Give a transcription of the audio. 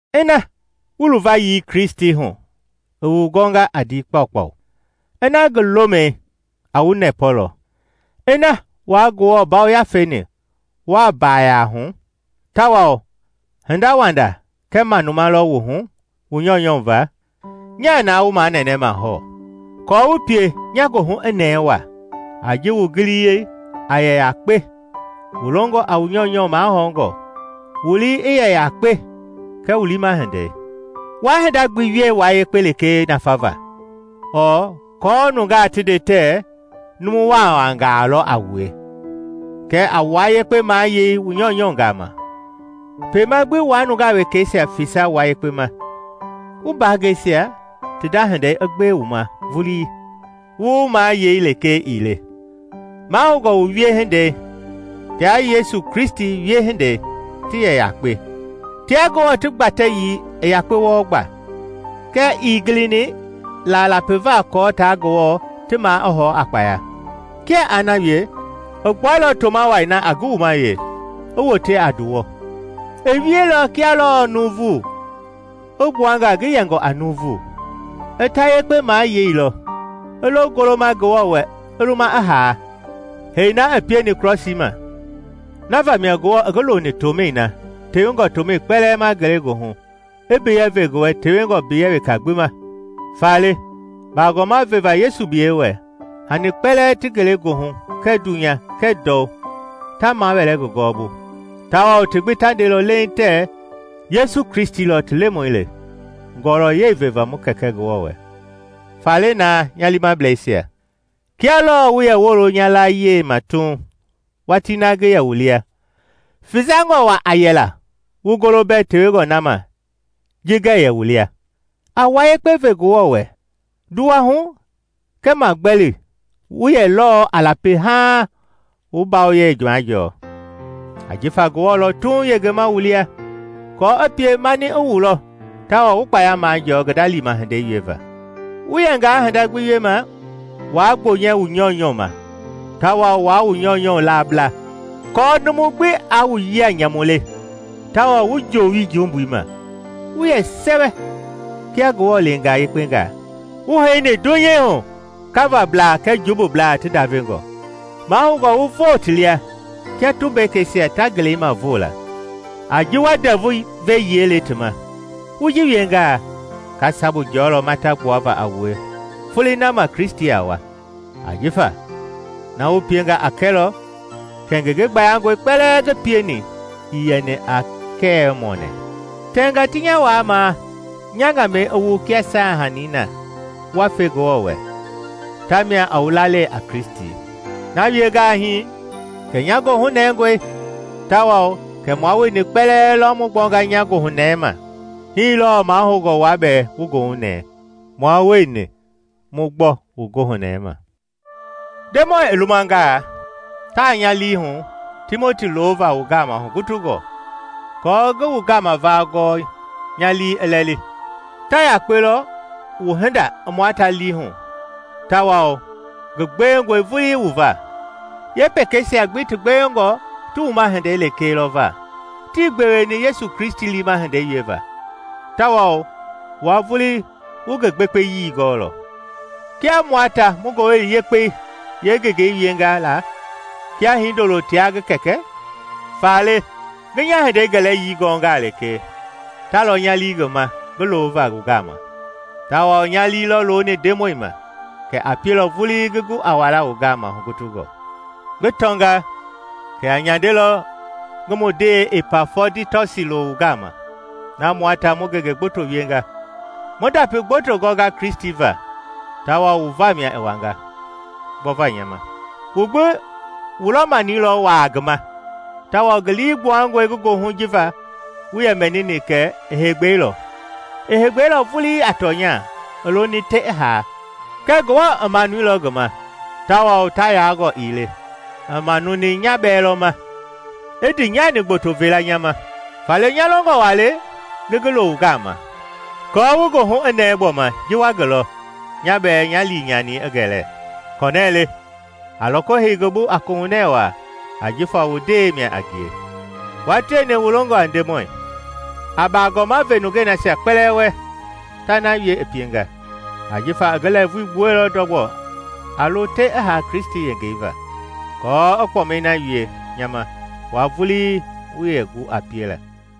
Ina wu luvayii Kristi hu i wu gɔnga a ndii kpakpau, ina ngi lomɛi a wu nɛpɔlɔ, ina wua Ngewɔ Yafei-ni wuaa mbaaya hu, tawao hindawanda kɛɛ manuma lɔ wu hu wu nyɔunyɔ va, Nyaa na wu manɛnɛma hɔɔ, kɔɔ wu pie nya goohu i nɛɛ waa a ji wu giliyii a yɛ yakpe, wu longɔ a wu nyɔunyɔ mahɔɔngɔ, wu lii i yɛ yakpe kɛɛ wu liima hindei. Waa hinda gbi wie wua yekpe lekee nafava, ɔɔ aako nungaa ti nde tɛɛ numu waawaangaa lɔ a wue, kɛɛ a wua yekpe mayei wu nyɔunyɔ gama, kpema gbi wa nungaa wekɛisia fesa wua yekpe ma. Wu mbaangɛisia ti nda hindei i gbewe wu ma vulii, wu wumayei lekee ii le. Mahoungɔ wu wiehindei tia Yesu Kristi wiehindei ti yɛ yakpe: Tia Ngewɔ ti gbatɛyii i yakpe wɔɔ gba, kɛɛ ii gilini la lapiva kɔɔ taa Ngewɔ ti maa i hɔɔ a kpaya. Kia aa na wie, i gbuailɔ toma wai na a ngi wumaye, i wote a nduwɔ. I wieilɔ kia lɔɔ nuuvu, i gbua nga ngi yɛngɔ a nuuvu. I ta yekpe mayeilɔ, i lo goloma Ngewɔ wɛ i luma i haa, hee na i pieni krɔsii ma. Na vamia Ngewɔ i ngi loni tomɛi na tewengɔ tomɛi kpɛlɛɛ ma ngelegoohu, i mbiyɛ ve ngi wɛ tewengɔ mbiyɛ weka gbi ma. Faale, baagɔma veva Yesu biyɛi wɛ, Hani kpɛlɛɛ ti ngelegoohu kɛɛ dunya kɛɛ ndɔu ta mawɛɛlɔ ngi gɔɔbu, tawao ti gbi ta ndelɔ leiŋ tɛɛ Yesu Kristi lɔ ti Lemɔi le ngɔlɔyɛi veva mu Kɛkɛ Ngewɔ wɛ. Faale naa nya liimablɛisia, kia lɔɔ wu yɛ woolo nya layie ma tuuŋ watii na ngi yɛ wu lia, fesangɔ waa a yɛla wu golo mbɛ tewengɔ na ma ji ngɛɛ yɛ wu lia. A wua yekpe ve Ngewɔ wɛ nduwahu kɛɛ magbɛli wu yɛ lɔɔ a lapi haaŋ wu mbawoyei majɔɔ, ajifa Ngewɔ lɔ tuuŋ yengema wu lia, aako i pie mani i wu lɔ tawao wu kpaya majɔɔ ngi nda liima hindei wieva. Wu yɛngaa hinda gbi wiema, waa gbonyɛ wu nyɔunyɔ ma tawao waa wu nyɔunyɔ laabla, aako numu gbi aa wu yia nyamu le tawao wu joowi jumbui ma, wu yɛ sɛwɛ kia Ngewɔ leengaa yekpengaa, wu heini dunya hu kavablaa kɛɛ jumbublaa ti ndavengɔ. Mahoungɔ wu voo ti lia kia tumbekeisia ta ngelei ma voo la, a ji wa Ndɛvu ve yiɛi le ti ma. Wu ji wiengaa, nga sabu jɔlɔ mata gbuava a wue Folei na ma Kristi a wa, ajifa na wu pienga a kɛlɔ kɛ ngenge gbayangɔi kpɛlɛɛ ngi pieni ii yɛni a kɛɛwɛ-mɔɔnɛ. Tɛnga ti nya waamaa nya ŋamɛi i wu kia saahanii na wa fe Ngewɔ wɛ, tamia a wu lalei a Kristi. Na wiengaa hii, kɛ nya goohu nɛngɔe tawao kɛ mua wueni kpɛlɛɛ lɔ mu gbɔnga nya goohunɛɛi ma. Hii lɔɔ mahoungɔ wua bɛɛ wu goohunɛɛ, mua wueni mu gbɔ wu goohunɛɛi ma. Ndemɔi i lumangaa, taa nya lii hu Timoti loova wu gama hugutungɔ, kɔɔ ngi wu gama va gɔɔ nya lii i lɛli. Ta yakpe lɔ wu hinda i mua ta lii hu tawao ngi gbewengɔe vulii wu va. Yeepekeisia gbi ti gbewengɔ ti wuma hindei lekee lɔ va, tii gbeweni Yesu Kristi liima hindei wieva. Tawao wua vulii wu ngi gbekpeyii gɔɔlɔ, kia mua ta mu Ngowili Yekpei yeengengei wienga la kia hindolo tia ngi kɛkɛ. Faale ngi nya hindei gɛlɛyii gɔngaa lekee, ta lɔ nya lii ngi ma ngi loova wu gama. Tawao nya lii lɔ looni Ndemɔi ma kɛ a pielɔ vulii ngi gu a wala wu gama hugutungɔ. Ngi tɔnga kɛ a nyandelɔ ngi mu ndee Ipafɔditɔsi lo wu gama na mua ta mu ngenge gboto wienga, mu ndapi gboto gɔnga Kristi va tawao wu vamia i wanga, gbɔva nya ma. Wu gbi wu lɔ-mani lɔ waa ngi ma, tawao ngi lii gbuangɔe ngi goohu jifa wu yɛ mɛniilɔ kɛ i heegbɛilɔ. I heegbɛilɔ vulii a tɔnya, i loni te i haa. Kɛɛ Ngewɔ i manuilɔ ngi ma, tawao ta yaangɔ ii le, i manuni nya bɛɛ lɔ ma, i ndiinyani gboto veela nya ma. Faale nya longɔ waa le ngi ngi lo wu gama aako wu goohu i nɛɛ gbɔma ji wa ngi lɔ, nya bɛɛ nya liinyani i gɛlɛ. Kɔnɛle a loko hei ngi bu a kohunɛ waa ajifa wu ndee mia a ngie, wua tieni wu longɔ a Ndemɔi. A baagɔma ve nungei nasia kpɛlɛɛ wɛ ta na wie i pienga, ajifa i ngi lɛɛvui gbuɛilɔ ndɔgbɔ a lo te i haa Kristi yengei va, kɔɔ i kpɔmɛi na wie nya ma wua vulii wuii yɛ gu a piela.